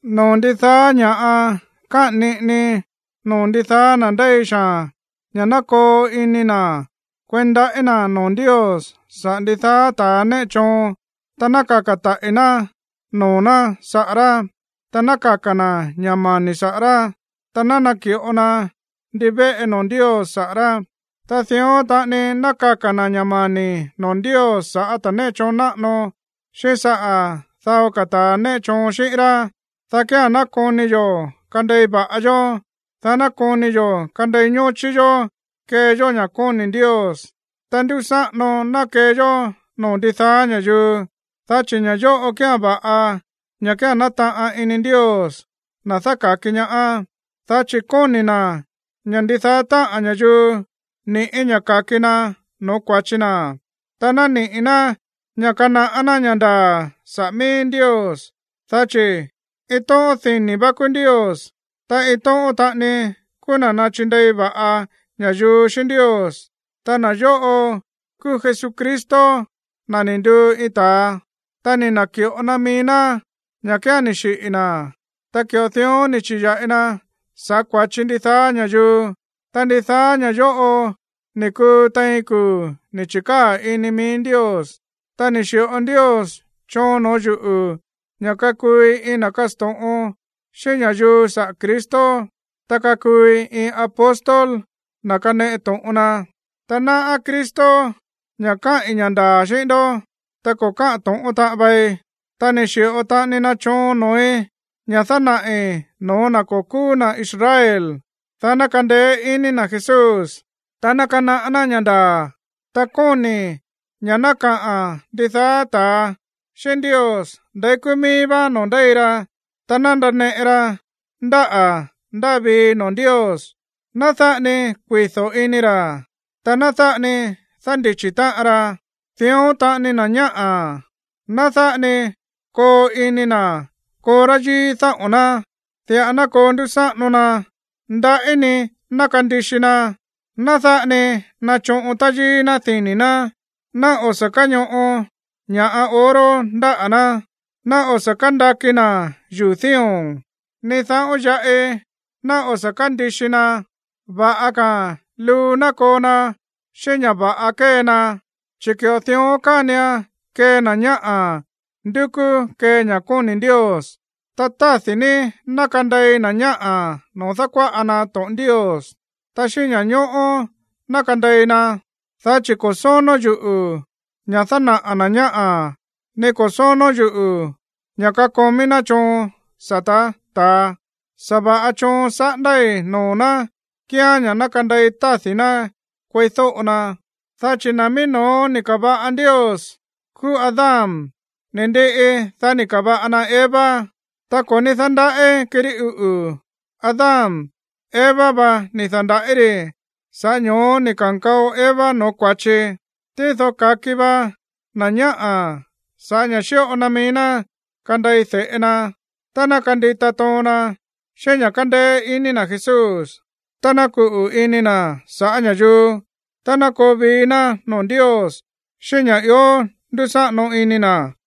Noo̱ ndidaá ña̱ꞌa káꞌa̱n niꞌinii noo̱ ndidaá na̱ ndéi xaa̱n ña̱ ná koo ini na̱ kueí ndaꞌí na̱ noo̱ Ndios saꞌa̱ ndidaá ta̱ néꞌe choon, ta ná kaka̱ taꞌi̱ ná noo̱ ná saꞌa̱ rá, ta ná kaka̱ na̱ ña̱ mani̱ saꞌa̱ rá, ta ná naki̱ꞌo na ndivéꞌe noo̱ Ndios saꞌa̱ rá. Ta dión taꞌani ná kaka̱ na̱ ña̱ mani̱ noo̱ Ndios sa̱ꞌá ta̱ néꞌe choon náꞌano, xíꞌín saꞌa̱ dao ka̱ ta̱a néꞌe choon xi̱ꞌín rá, dá kía̱n ná koni yo̱ kandei va̱ꞌa yó, dá ná koni yo̱ kandei ñóchí yó kee yó ña̱ kóni̱ Ndios, ta ndúsáꞌano ná kee yó noo̱ ndidaá ña̱yuu. Dá chi̱ ña̱ yóꞌo kía̱n va̱ꞌa, ña̱ kía̱n nátaꞌan ini Ndios, na̱ dáka̱ki ñaá. Dá chi̱ kóni̱ na̱ ña̱ ndidaá táꞌa̱n ña̱yuu niꞌi̱ ña̱ ka̱ki na no̱ó kua̱chi na, ta naniꞌi̱ ná ña̱ kanaꞌá ná ña̱ ndaa̱ saꞌa̱ mií Ndios. Dá chi̱ iin tóꞌón dini̱ vá kúú Ndios, ta iin tóꞌón taꞌani kúú na̱ náchindei va̱ꞌa ña̱yuu xíꞌín Ndios, ta na̱ yóꞌo kúú Jesucristo, na̱ ni̱ nduu iin ta̱a. Ta ni̱ na̱ki̱ꞌo na mií ná ña̱ kía̱n ni̱ xiꞌi̱ na̱, ta ki̱ꞌo dión ni̱ chi̱ya̱ꞌi na sa̱ꞌá kua̱chi ndidaá ña̱yuu. Ta ndidaá ña̱ yóꞌo ni̱ kuu tein kuu̱ ni̱ chi̱kaa̱ ini mií Ndios. Ta ni̱ xi̱ꞌo Ndios choon noo̱ yúꞌu̱ ña̱ kakuui iin na̱ kasto̱ꞌon xíꞌín ña̱yuu saꞌa̱ Cristo, ta kakuui iin apóstol, na̱ kaneꞌe to̱ꞌon na, (ta náꞌá Cristo ña̱ káꞌi̱n ña̱ ndaa̱ xíꞌín ndó, ta ko̱ káꞌa̱n to̱ꞌón taꞌan vai.) Ta ni̱ xi̱ꞌo taꞌani na choon noo̱í ña̱ dánaꞌi̱ no̱ó na̱ ko̱ kúú na̱ Israel, dá ná kandeé iní na̱ Jesús, ta ná kanaꞌá ná ña̱ ndaa̱. Ta kóni̱i̱ ña̱ ná kaꞌa̱n ndidaá ta̱a xíꞌín Ndios ndeí kúú mií vá noo̱ ndéi ra, ta ná ndaneꞌe ra ndáꞌa̱ ndáa vii noo̱ Ndios. Ná dáꞌa ni kuido̱ ini ra̱, ta ná dáꞌa ni dándichi̱ táꞌan ra. Dión taꞌani, na̱ ñáꞌa̱, ná dáꞌa ni koo ini na̱ koo táyíí dáꞌo̱n ná. Diꞌa ná koo ndúsáꞌano na, ndaꞌí ni ná kandixi na. Ná dáꞌa ni nachoꞌon táyíí ná dini̱ ná, ná o̱ sa̱ káñoꞌo ña̱ꞌa oro ndáꞌa̱ ná, ná o̱ sa̱ kándaki na̱ yuu̱ dío̱n, ni dáꞌo̱n yaꞌi ná o̱ sa̱ kándixi na. Va̱ꞌa ka̱a̱n luu ná koo na xíꞌín ña̱ va̱ꞌa kée na, chi̱ ki̱ꞌo dión kánian kee na̱ ñáꞌa̱ ndúkú kee ña̱ kóni̱ Ndios. Ta tádi̱ ní ná kandei na̱ ñáꞌa̱ noo̱ dákuáꞌa na to̱ꞌon Ndios, ta xíꞌín ña̱ñóꞌó ná kandei na. Dá chi̱ ko̱ sónó yuꞌu̱ ña̱ dánaꞌa̱ na̱ ñáꞌa̱, ni ko̱ sónó yuꞌu̱ ña̱ kakomí ná choon sa̱tá ta̱a. Sa̱va̱ꞌa choon saꞌándái̱ noo̱ ná kíán ña̱ ná kandei tádi̱ ná kueídóꞌo na. Dá chi̱ na̱ mií no̱ó ni̱ ka̱va̱ꞌa Ndios kúú Adán, ni̱ ndiꞌi, dá ni̱ ka̱va̱ꞌa na Eva. Ta ko̱ ní dándaꞌí kirí uꞌu̱ Adán. Eva va ni̱ da̱nda̱ꞌí ri̱. Sa̱ꞌá ño̱ó ni̱ ka̱nkao Eva no̱ó kua̱chi. Tído ka̱ki vá na̱ ñáꞌa̱ sa̱ꞌá ña̱ xíꞌo na mií ná kandei de̱ꞌe na tá ná kandita toon na xíꞌín ña̱ kándéé iní na̱ Jesús, tá ná kuꞌu̱ ini na̱ saꞌa̱ ña̱yuu, tá ná koo vii ná noo̱ Ndios xíꞌín ña̱ ió ndúsáꞌano ini na̱.